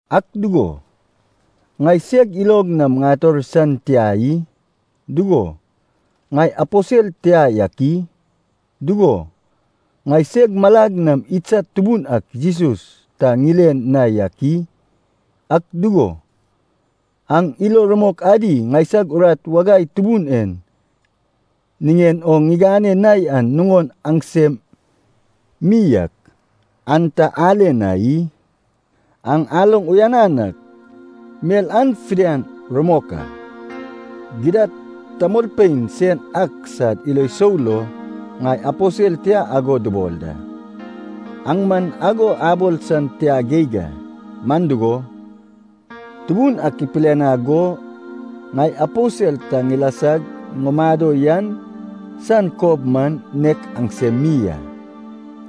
Ak dugo, ŋai seg ilog nam ŋator san tia i? Dugo, ŋai aposel tia yak i? Dugo, ŋaiseg malag nam idsad Tubun ak Jesus ta ŋile na yak i? Ak dugo, aŋ ilo rumok adi ŋaisag urat wagai Tubun en niŋen o ŋigane na yan nuŋon aŋsem mi yak, an ta ale na i? Aŋ aloŋ uyanan ak, mel an fidian rumok a. Gidad tamolpein sen ak sad ilo sou lo ŋai aposel tia ago dubol da, aŋ man ago abol san tia geig a. Man dugo, Tubun ak ipilianag go ŋai aposel ta ŋilasag ŋumado yan san kob man, nek aŋsem mi a.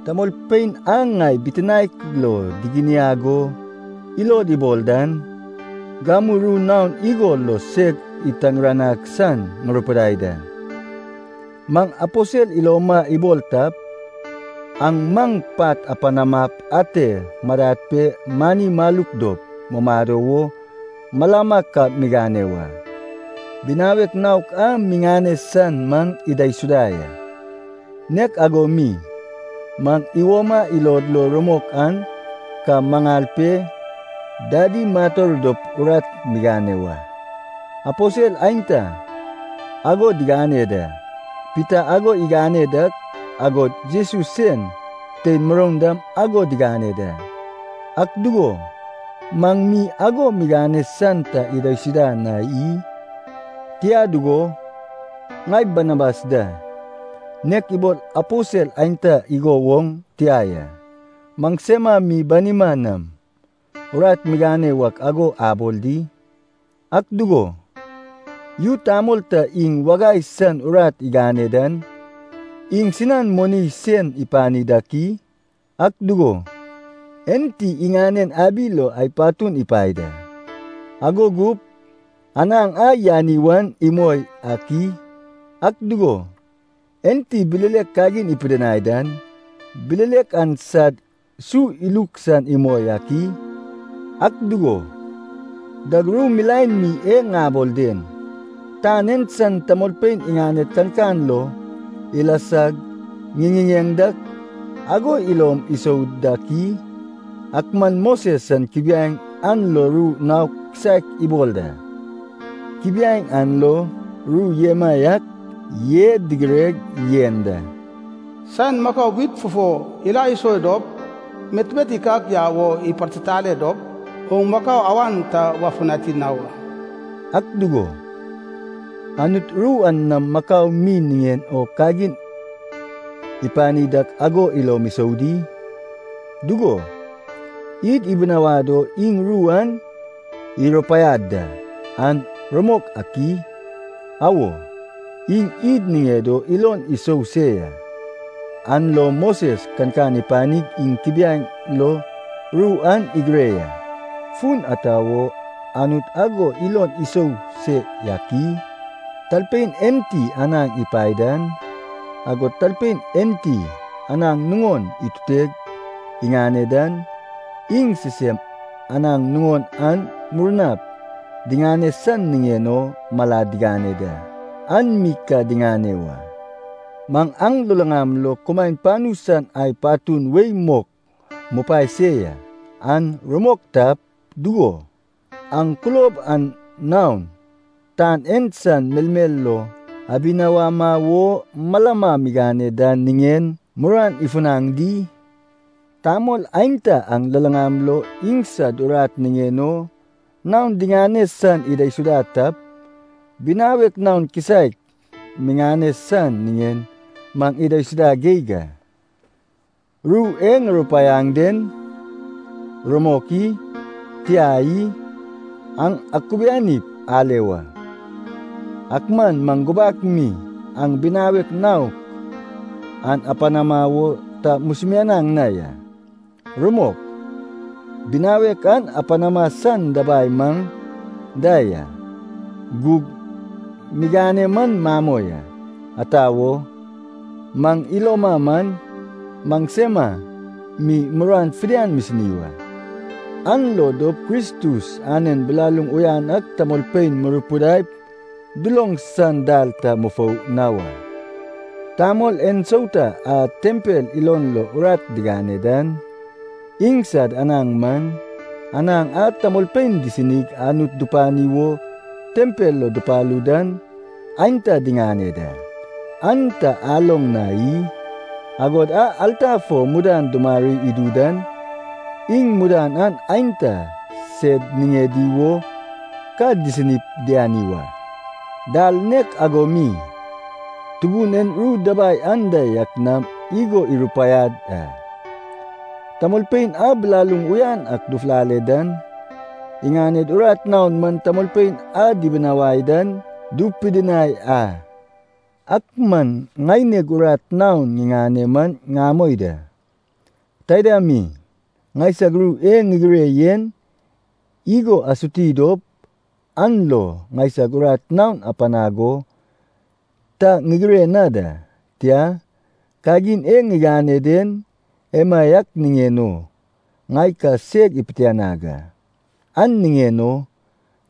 Tamolpein a ŋai bitinaek lo diginiag o ilod ibol dan, gamu ru naon igo lo seg itargiranag san ŋurupidai da. Maŋ aposel iloma ibol tap, aŋ maŋ pat apanamap ate madad pe mani maluk dop mumado wo malama ka migane wa. Binawek naok a miŋane san maŋ idaisuda ya. Nek ago mi, maŋ iwoma ilod lo rumok an ka maŋal pe dadi mator dop urat migane wa. Aposel aenta ago digane da, Pita ago igane dak, agod Jesus sen tein muroun dam ago digane da. Ak dugo, maŋ mi ago migane san ta idaisuda na i? Tia dugo, ŋai Banabas da, nek ibol aposel aenta igo woŋ tia ya, maŋsema mi banima nam urat migane wak ago abol di? Ak dugo, yu tamol ta iŋ wagai san urat igane dan, iŋsinan moni sen ipani dak i? Ak dugo, enti iŋanen abi lo ai patun ipae da, ago gup anaŋ a yani wan imoi ak i? Ak dugo, enti bilelek kagin ipidinai dan, bilelek an sad su iluk san imoi ak i? Ak dugo, dag ru milaen mi e ŋabol den, tan en san tamolpein iŋaned kankan lo ilasag ŋiŋiŋeŋ dak ago ilom isou dak i? Ak man Moses san kubiaeŋ an lo ru naok kisaek ibol da. Kubiaeŋ an lo ru emaiak e digireg yen da, “Saen makau wit fufo ila iso dop metmet ikak yau o ipartitale dop, oŋ makau awan ta wafutani na wa.” Ak dugo, Anut ru an nam makau mi niŋen o kagin ipani dak ago ilom isou di? Dugo, id ibinawad o iŋ ru an irupaiad da, an rumok ak i? Awo, iŋ id niŋed o ilon isou se ya, an lo Moses kankan ipanig iŋ kubiaeŋ lo ru an igire ya. Fun ata wo Anut ago ilon isou se yak i? Talpein enti anaŋ ipae dan, agod talpein enti anaŋ nuŋon ituteg iŋane dan, iŋ sisem anaŋ naon a murnap diŋane san niŋen o malad digane da, an mi ka diŋane wa. Maŋ aŋ luluŋam lo kumaen panu san ai patun wei mok mupae se ya, an rumok tap, dugo, aŋ kulob an naon, tan en san melmel lo abinawama wo malama migane dan niŋen muruan ifunaŋ di? Tamol aenta aŋ luluŋam lo iŋsad urat niŋen o naon diŋane san idaisuda tap, binawek naon kisaek miŋane san niŋen maŋ idaisuda geig a! Ru e ŋurupaiaŋ den, rumok i? Tia i? Aŋ akubianip ale wa. Ak man maŋ gubak mi aŋ binawek naok an apanama wo ta musumianaŋ na ya. Rumok, binawek an apanama san dabai maŋ da ya, gug miŋane man mamoi a. Ata wo? Maŋ iloma man, maŋsema mi muruan fidian misini wa, an lo dop Kristus anen bilaluŋ uyan ak tamolpein murupidaip duloŋ san dal ta mufou na wa. Tamol ensauta a tempel ilon lo urat digane dan, iŋsad anaŋ man, anaŋ a tamolpein disinig Anut dupani wo tempel lo dupalu dan aenta diŋane da, an ta aloŋ na i? Agod a alta fo mudan dumari idu dan, iŋ mudan an aenta sed niŋedi wo ka disinip diani wa. Dal nek ago mi, Tubun en ru dabai anda yak nam igo irupaiad a, tamolpein a bilaluŋ uyan ak dufulale dan, iŋaned urat naon man tamolpein a dibinawai dan dupidinai a. Ak man ŋaineg urat naon ŋiŋane man ŋamoi da. Taida mi, ŋaisag ru e ŋigire yen igo asuti dop an lo ŋaineg urat naon apanag o ta ŋigire na da. Tia, kagin e ŋigane den, emaiak niŋen o ŋai ka seg ipitianag a, an niŋen o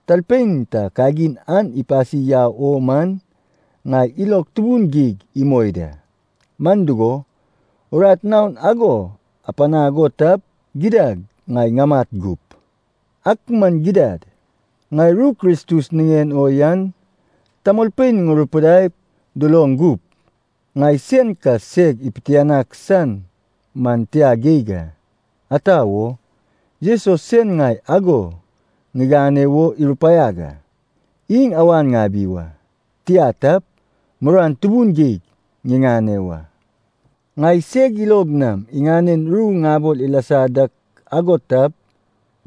talpein ta kagin an ipasi yau o man, ŋai ilog tubun geig imoi da. Man dugo, urat naon ago apanag o tap, gidad ŋai ŋamat gup. Ak man gidad, ŋai ru Kristus niŋen o yan tamolpein ŋurupidaip duloŋ gup, ŋai sen ka seg ipitianag san man tia geig a. Ata wo? Jesus sen ŋai ago ŋigane wo irupaiag a. Iŋ awan ŋabi wa, tia tap, muruan tubun geig ŋiŋane wa! Ŋai seg ilog nam iŋanen ru ŋabol ilasa dak ago tap,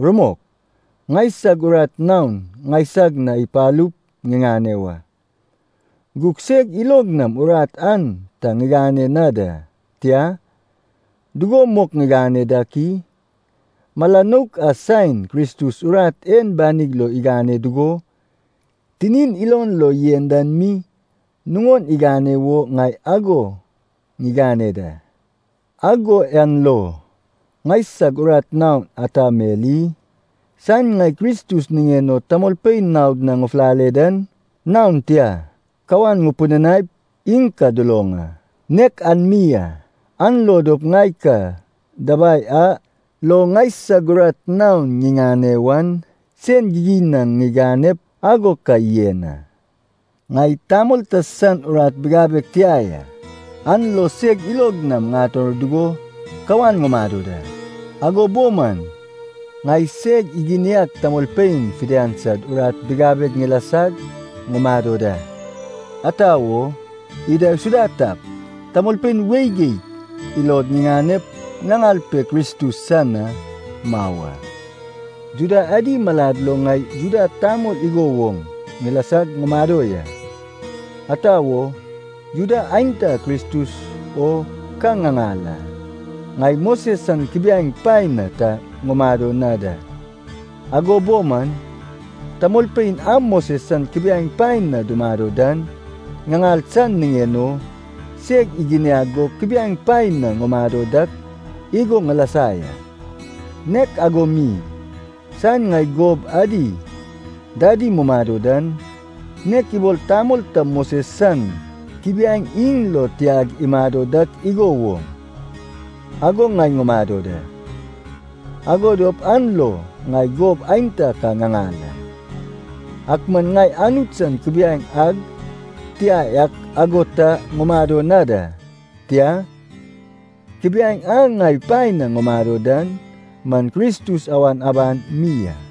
rumok, ŋaisag urat naon ŋaisag na ipalup ŋiŋane wa. Gug seg ilog nam urat an ta ŋigane na da. Tia, dugo mok ŋigane dak i? Mala nouk a saen Kristus urat en banig lo igane dugo, tinin ilon lo yen dan mi, nuŋon igane wo ŋai ago ŋigane da. Ago yan lo ŋaisag urat naon ata mel i? Saen ŋai Kristus niŋen o tamolpein naod na ŋufulale dan, naon tia kawan ŋupidinaip iŋ ka duloŋ a, nek an mi a. An lo dop ŋai ka dabai a lo ŋaisag urat naon ŋiŋane wan, sen gigin na ŋiganep ago ka yen a. Ŋai tamol ta san urat bigabeg tia ya, an lo seg ilog nam ŋator dugo kawan ŋumado da. Ago bo man ŋai seg iginiag tamolpein fidian sad urat bigabeg ŋilasag ŋumado da. Ata wo? Idaisuda tap, tamolpein wei geig ilod ŋiŋanep ŋaŋal pe Kristus san na mau a. Juda adi malad lo ŋai Juda tamol igo woŋ ŋilasag ŋumado ya, ata wo, Juda aenta Kristus o ka ŋaŋal a. Ŋai Moses san kubiaeŋ paen na ta ŋumado na da, ago bo man tamolpein a Moses san kubiaeŋ paen na dumado dan ŋaŋal san niŋen o, seg iginiag go kubiaeŋ paen na ŋumado dak igo ŋilasa ya. Nek ago mi, saen ŋai gob adi dadi mumado dan, nek ibol tamol ta Moses san kubiaeŋ iŋ lo tiag imado dak igo woŋ, ago ŋai ŋumado da. Ago dop an lo ŋai gob aenta ka ŋaŋal a. (Ak man ŋai Anut san kubiaeŋ ag tia yak ago ta ŋumado na da, tia, kubiaeŋ a ŋai paen na ŋumado dan man Kristus awan aban mi a.)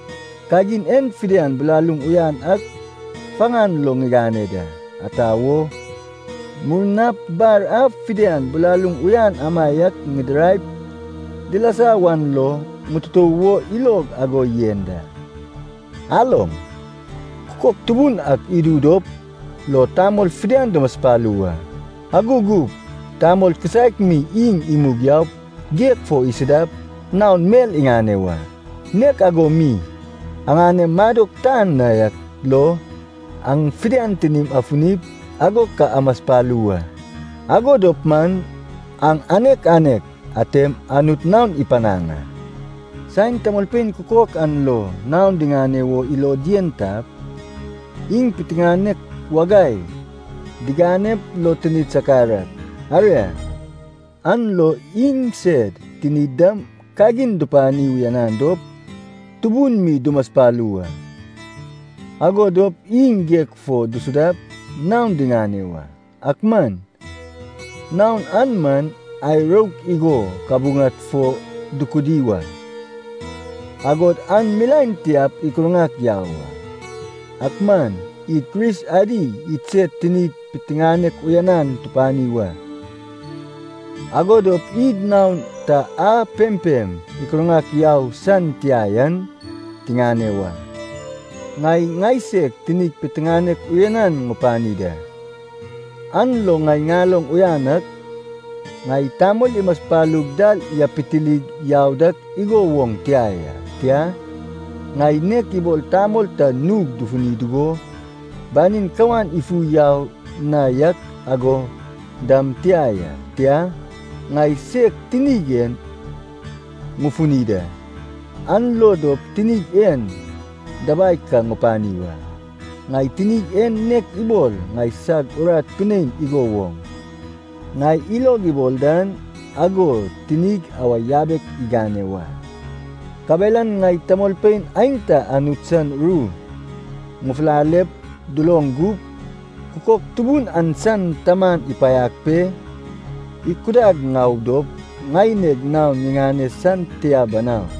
Kagin en fidian bilaluŋ uyan ak faŋan lo ŋigane da, ata wo, murnap bar a fidian bilaluŋ uyan amaiak idiraip dilasa wan lo ŋututou wo ilog ago yen da. Aloŋ, kukok tubun ak idu dop lo tamol fidian dumaspalu wa, ago gup tamol kisaek mi iŋ imug yaup geg fo isudap naon mel iŋane wa. Nek ago mi aŋanem madok tan na yak lo, aŋ fidian tinim afunip ago ka amaspalu wa, ago dop man aŋ anek anek atem Anut naon ipanaŋ a. Saen tamolpein kukok an lo naon diŋane wo ilod yen tap, iŋ piteŋanek wagai diganep lo tinid sakar ak, aria, an lo iŋsed tinid dam kagin dupani uyanan dop, tubun mi dumaspalu wa. Ago dop iŋ geg fo disudap naon diŋane wa. Ak man naon an man, ai rouk igo kabuŋad fo dukudi wa, agod an milaen tiap ikurŋak yau a. Ak man id Kris adi idsed tinid piteŋanek uyanan tupani wa, ago dop id naon ta a pempem ikurŋak yau san tia yan tiŋane wa. Ŋai ŋaiseg tinig piteŋanek uyanan ŋupani da. An lo ŋai ŋaloŋ uyan ak, ŋai tamol imaspalug dal yapitilig yau dak igo woŋ tia ya, tia, ŋai nek ibol tamol ta nug dufuni dugo, banin kawan ifu yau na yak ago dam tia ya. Tia, ŋai seg tinig en ŋufuni da, an lo dop tinig en dabai ka ŋupani wa. Ŋai tinig en nek ibol ŋaisag urat pinein igo woŋ, ŋai ilog ibol dan ago tinig awa yabek igane wa. Kabelan ŋai tamolpein aenta Anut san ru ŋufulalep duloŋ gup, kukok tubun an san taman ipaiag pe ikudag ŋau dop ŋaineg naon ŋiŋane san tia banau.